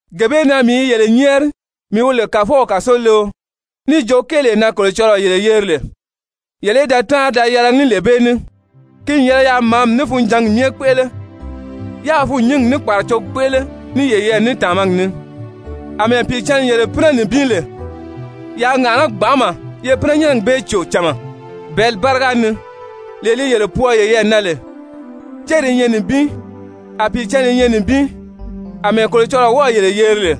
Gee bee na mii i yele nyɛ́ɛri, mii wi lè Kàfɔw kàsoleo, níì jo kéelee na Kolocɔlɔɔ yele yeri lè, yele í da táanri da yɛlɛgi ní lee bee ní. Ki n yɛlɛ yaa màámi ní funjǎngi myɛ kpéʔele, yáā fûnnyingi ní kpàracogi kpéʔele ní yeyɛɛ ní tàmagi ni. Amɛɛ Pìicǎnni yele pínɛ nibin lè, yaa ŋàʔaná gbanʔama, ye pínɛnyɛnnɛgi bee cò cama bɛ̀ɛ́li báriga ni, lee li yele pwɔɔ yeyɛɛ na lè. Céri i nyɛ nibin, a Pìicǎnni i nyɛ nibin àmɛɛ Kolocɔlɔɔ wɔ́ɔ̀ yele yeri lè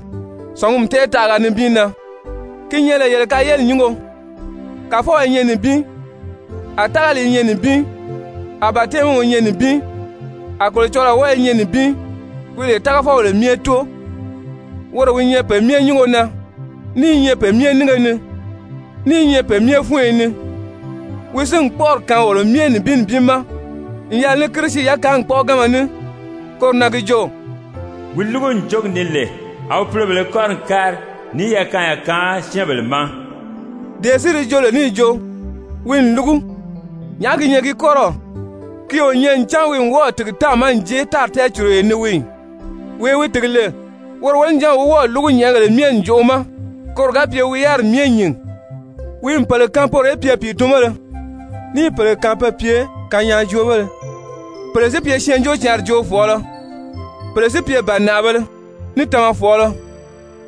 sɔ̀ngumi tɛɛtaʔaga nibin na ki nyɛ lè yele kayeli nyúngo. Kàfɔw i nyɛ nibin, a tágali i nyɛ nibin, a batɛmiw i nyɛ nibin, a Kolocɔlɔɔ wɔ́ɔ i nyɛ nibin wi lè tágafɔbèle myɛ Tóo, woro wi nyɛ pe myɛ nyúngo na, ní i nyɛ pe myɛ nínge ni, ní i nyɛ pe myɛ fúnyo ni. Wi si n kpɔ́ʔɔri kaan wolo myɛ nibin nibin ma n yɛlɛ ní Kirisi yakaangi kpɔ́ʔɔganma ní. Koro na gi jo: «Wi lúgu ǹjogi ni lè, a wi pulobèlē kɔ́ri n kári níì yakaanya kaan syɛ́ɛnbèle ma.» Dee si di joo lè níì jo: «Wi n lúgu,» nyàʔá gi nyɛ gi kɔ́rɔw? Ki o nyɛ ncan wi n wɔ́ɔ̀ tìgi táàma n jée tári tɛɛcuruyo ni wii ì? Wee wi tìgi lè, woro wonijanw wi wɔ́ɔ̀ lúgu nyɛ̀ʔɛgèle myɛ ǹjoʔo ma, koro ga pye wi yáriri myɛ nyìn. Wi n pèle kaan poro í pye pìitunbéle, níì pèle kaan pe pye kanyaajoobéle, pèle si pye Syɛɛnjóocǎnri joofɔɔlɔ, pèle si pye bànaʔabēle ní tamafɔɔlɔ.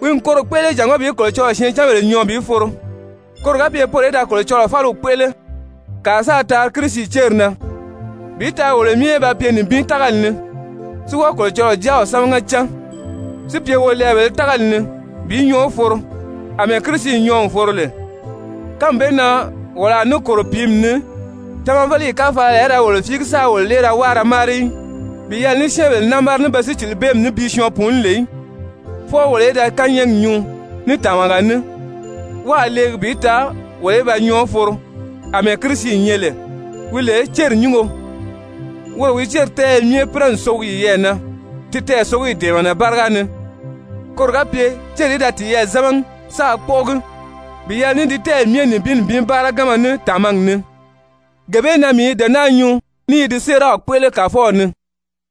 Wi n koro kpéʔele jàngó bi Kolocɔlɔɔ syɛɛncanbèle nyɔɔ bi foro, koro ga pye poro í da Kolocɔlɔɔ fáliw kpéʔele, kàa sáā taari Kirisi céri na, bi taa wolo myɛ í ba pye nibin tágali ni, si wɔ́ɔ Kolocɔlɔɔ Jáaw sámaga cán, si pye wolɛɛbèlē tágali ni bi nyɔɔ foro àmɛɛ Kirisi nyɔɔ n foro lè. Kánmi bee na wolo a ní kòro pìími ni, tamaveleyi káfalaya í ra wolo fíigi sáā wolo lée ra wáa da máari í bi yɛlɛ ní syɛ́ɛnbèle námara, ní be sícilibeemi ní bi syɔɔn pùuní lè í, fwɔɔ wolo í da kányɛɛgi nyuu ní tàmaga ní wáā leegi bi taa wolo í ba nyɔɔ foro àmɛɛ Kirisi nyɛ lè, wi lè céri nyúngo. Woro wi céri tɛ́ɛyɛ pínɛ n sogi yiyɛɛ na ti tɛɛsogiyi dɛ̀ɛmɛnɛ báriga ni, koro ga pye céri í da tiyɛɛ zámagi, sáā kpɔ́ʔɔgi bi yɛlɛ ní ti tɛ́ɛyi myɛ nibin nibin báaraganma ní tàmagi ni. Gee bee na mii i dee naa nyuu ní i di séeraw kpéʔele Kàfɔw ni,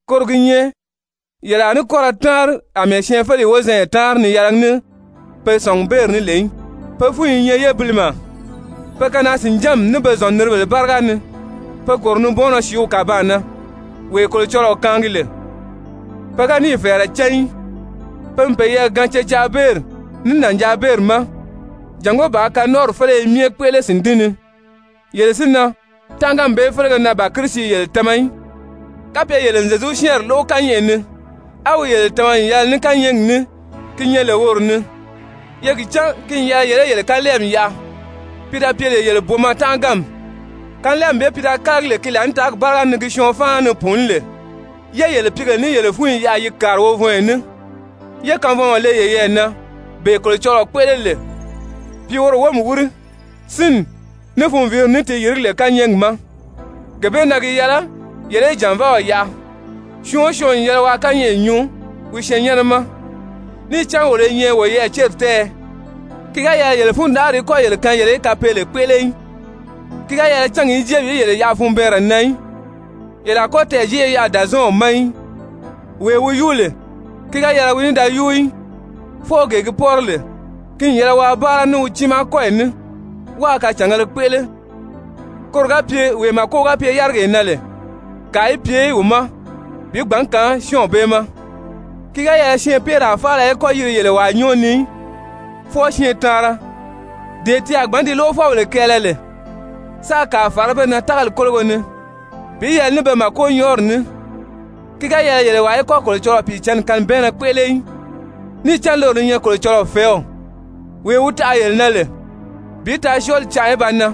koro gi nyɛ yele a ní kɔ́ ra táanri àmɛɛ syɛɛnfeleyi wozanya táanri ni yɛlɛgi ní pe sɔ̀ngubeeri ní lè í. Pe fúnyi i nyɛ yébilimɛ, pe kanaa-sìnjánmi ní be zɔ̀nniribèle báriga ni be kòro nibɔɔnnɔ sìíw kàbaan na, wee Kolocɔlɔɔ kaangi lè. Pe ga níì fɛ̀ɛrɛ cán í, pe n peyɛɛ gaan cecaabeeri ní nànjaabeeri ma jàngó bàā kanɔnʔɔri féleye myɛ kpéʔele sìndín ni. Yele si na, tánʔaganmi bee félege na ban Kirisi yele tama í. Kapye yele n Zyezu syɛ́ɛnri lóʔo kányɛʔɛ ni, á wi yele tama n yɛlɛ ní kányɛɛgi ní ki nyɛ lè woro ni, ye gi cán ki n yɛlɛ yele í yele kanlɛɛmi yaʔa, pi da pye lè yele booma tánʔaganmi, kanlɛɛmi bee pi da kálagi lè ki laànitaagi báriga ni gi syɔɔn fáana ni pùuní lè, yé yele pìígèle ní yele fúnyi yaʔa yi kàri wovɔnyɔ ní, yé kanvɔnmɔ le yeyɛɛ na, bee Kolocɔlɔɔ kpéʔele lè pi woro wómi wíri sínni, ní funviiri ni ti yìrigí lè kányɛɛgi ma. Gee bee na gi yɛlɛ yele í jànvaaw yaʔa, syɔɔn o syɔɔn n yɛlɛ yele ni waa kányɛʔɛ nyuu wi syɛɛnnyɛnnɛ ma. Níì cán wolo i nyɛ woyɛɛ céri tɛ́ɛyɛ. Ki ga yɛlɛ yele fundanʔari í kɔ́ yele kaan yele í kapeele kpéʔele í. Ki ga yɛlɛ cángi í jée bi yele yaʔa funbɛɛnrɛ na í. Yele a kɔ́ tɛɛ̀jeʔe yaʔa Dàzɔɔnw ma í. Wee wi yúu lè, ki ga yɛlɛ wi ní da yúu í, fwɔɔ gee gi pɔ́rɔ lè, ki n yɛlɛ waa báara ní wi tiimaa kɔ́yi ní wáā kacàngēle kpéʔele koro ga pye wee màko ga pye yárigee na lè, kàa í pye wi ma bi gbǎn kaan syɔ́ɔnw bee ma. Ki ga yɛlɛ syɛɛnpeeraa faala í kɔ́ yiri yele wàa nyɔ́ɔ ni í, fwɔɔ syɛɛntaanra, dee ti a gbǎn ti lóʔofɔbèle kɛɛlɛ lè, sáā kàa fàrá be na tágali kólogo ni bi yɛlɛ ní be màkonyɔɔri ní. Ki ga yɛlɛ yele wàa í kɔ́ Kolocɔlɔɔ Pìicǎnni kanibɛɛnnɛ kpéʔele í, níì cán loro li nyɛ Kolocɔlɔɔ fɛ̀ɛ́w, wee wi taʔa yele na lè bi taa syɔɔli canʔa í ba nan.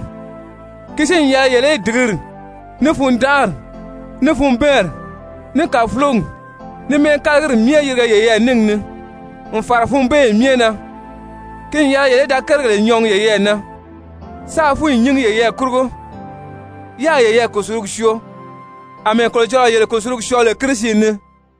Ki si n yɛlɛ yele í dìgiri, ní fundanʔari, ní funbɛɛnri, ní kàfulogi, ní mɛ́ɛkalagiri myɛ yirige yeyɛɛ níngi ni n fàra funbeeyi myɛ na. Ki n yɛlɛ yele í da kérigèle nyɔɔgi yeyɛɛ na, sáā fúnyi nyíngi yeyɛɛ kurugo, yáā yeyɛɛ kùsulugi syoo àmɛɛ Kolocɔlɔɔ yele kùsulugi syɔɔ lè Kirisi ni.